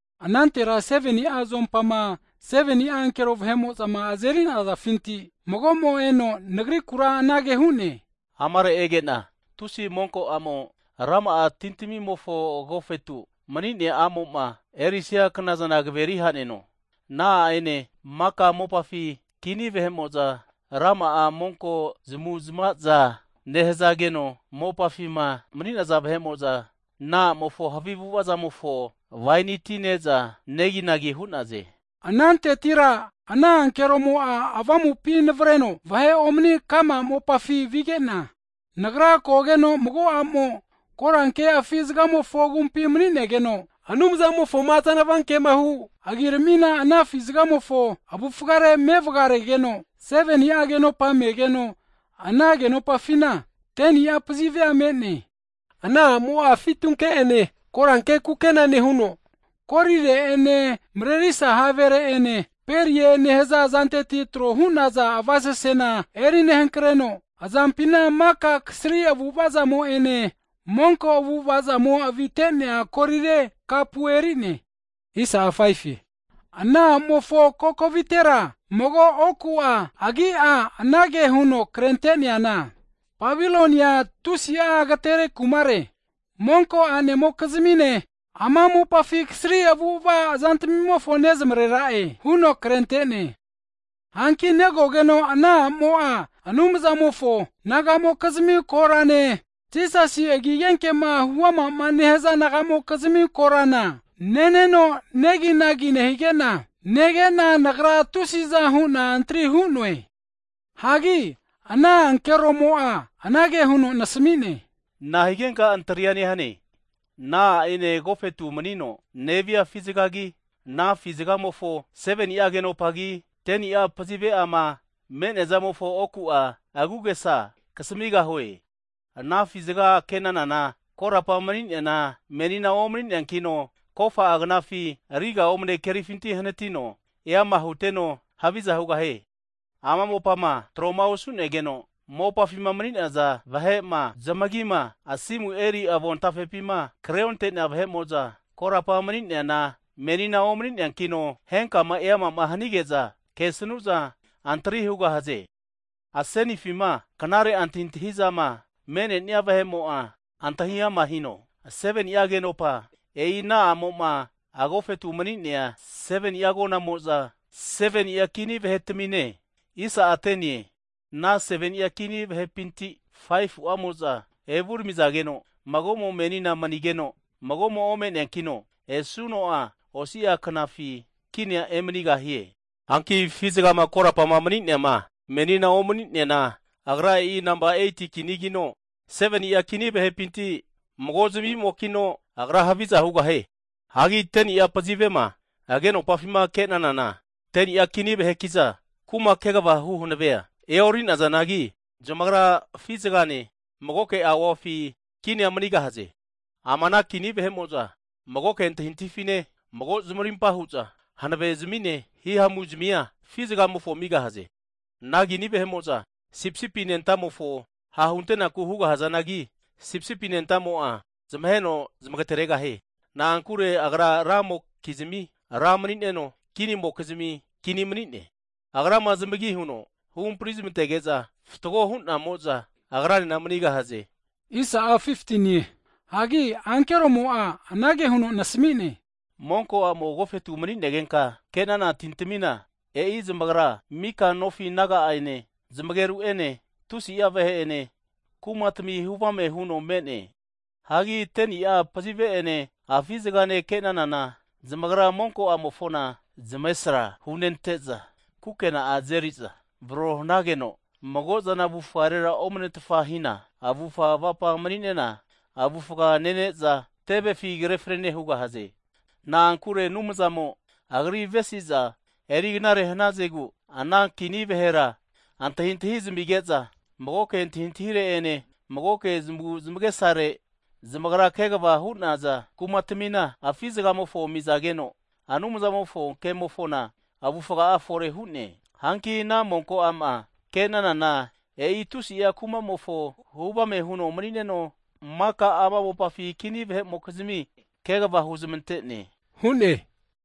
Anantera 7ni'a zuompama 7ni'a ankero vahe'mo'za azerinazafinti magomo eno nagrikura anage hu'ne, amare ege'na tusi monko a'mo rama'a tintamimofo agofetu mni'nea a'mo'ma erisia knazana kaveri haneno hu'ne. Ana a'ene maka mopafi kini vahe'mo'za, rama'a monko zmu'zmaza nehazageno, mopafima mni'naza vahe'mo'za, ana a'mofo havi avu'avazamofo waini ti neza neginagi hu'naze. Anantetira ana ankeromo'a avamupi navreno vahe omni ka'ma mopafi vigena, nagra kogeno mago a'mo, koranke afi zgamofo agumpi mni'negeno, Anumzamofoma azanava kemahu agiramina ana afi zgamofo avufgare mevgaregeno, 7ni'a agenopa megeno ana agenopafina, 10ni'a pazivea me'ne. Ana a'mo'a fitunke'ene koranke kukena nehuno, kolire'ene mrerisa havere'ene, perie (pearls) nehaza zanteti tro hu'naza avasasezana erinehankreno, azampina maka kasri avu'ava'amo'ene, monko avu'ava'amo avite'nea kolire kapu eri'ne. Ana a'mofo kokovitera mago oku'a agi'a anage huno krente'neana, Babilonia tusi'a agatere kumare, monko a'nemokizmine, ama mopafi kasri avu'ava zantamimofo nezmarera'e huno krentene. Hanki negogeno ana a'mo'a Anumzamofo nagamokizmi korane, Jisasi agi agenkema huamama nehza nagamokizmi korana ne'neno neginagi nehigena, negena nagra tusiza hu'na antri hu'noe. Hagi ana ankeromo'a anage huno nasami'ne, nahigenka antria nehane? Ana a'ene, agofetu mni'no nevia afi zgagi, ana afi zgamofo 7ni'a agenopagi, 10ni'a pazive'ama me'neazamofo oku'a agu'agesa'a kasamigahue. Ana afi zga kenanana, korapa mni'neana, menina omni'neankino, kofa'a knafi riga omne kerifinti hnatino, eama huteno haviza hugahie. Ama mopama tro'ma osu'negeno, mopafima mni'naza vahe'ma zmagima asimu eri avontafepima kreonte'nea vahe'mo'za, korapa mni'neana, menina omani'neankino, henkama eamama hanige'za kesnu'za antri hugahaze. Asenifima knare antahintahizama me'nenia vahe'mo'a antahi ama hino, 7ni'a agenopa, e'i ana a'moma agofetu mni'nea 7ni'a agonamo'za 7ni'a kini vahetamine. Ana 7ni'a kini vahepinti 5fu'amo'za evuramizageno, magomo menina mnigeno, magomo'a ome'neankino, esuno'a osi'a knafi kinia emanigahie. Hanki afi zgama korapama mni'neama, menina omnineana, agra e'i nampa 8ti kinigino, 7ni'a kini vahepinti mago zmimokino, agra haviza hugahie. Hagi 10ni'a pazivema agenopafima kenanana, 10ni'a kini vahekiza kuma kegvahu hanavea e'orinazanagi, zamagra afi zgane magoke auafi kinia manigahaze. Ama ana kini vahe'mo'za magoke antahintahifine, mago zmarimpa hu'za hanave zmine hihamuzmia afi zgamofo amigahaze. Ana kini vahe'mo'za Sipisipi Anentamofo ha' hunte'naku hugahazanagi, Sipisipi Anentamo'a zmaheno zmagateregahie. Na'ankure Agra ramokizmi, Ra mnineno, kini'mokizmi Kini manine. Agrama zamigi huno huhampri zmantege'za mni fatgo hu'namo'za, Agranena mnigahaze. Hagi ankeromo'a anage huno nasamine, monko a'mo agofetu mni'negenka kenana tintamina, e'i zmagra mika nofi naga ene, zmageru ene, tusi'a vahe ene, kumatami huvame huno me'ne. Hagi 10ni'a pazive'ene afi zganema kenanana, zamagra monko a'mofona zmavesra hunente'za kukena'a azeriza erivararo hanageno mago'zana avufarera omanetfahina, avufga avapa mni'nena avufga'a nene'za, tevefi kre fnane hugahaze. Na'ankure Anumzamo Agri avesiza eri knare hnazegu, ana kini vahera antahintahi zamige'za magoke antahintahire'ene, magoke zmagu zmagesare zamagrama kegva hu'naza kumatamina afi zgamofo amizageno, Anumzamofo kemofona avufga'a fore hu'ne. Hanki ana monko a'ma ke'nanana, e'i tusi'a kumamofo hu avame huno manineno, maka ama mopafi kini vahe'mokizmi kegva hunezmante hu'ne.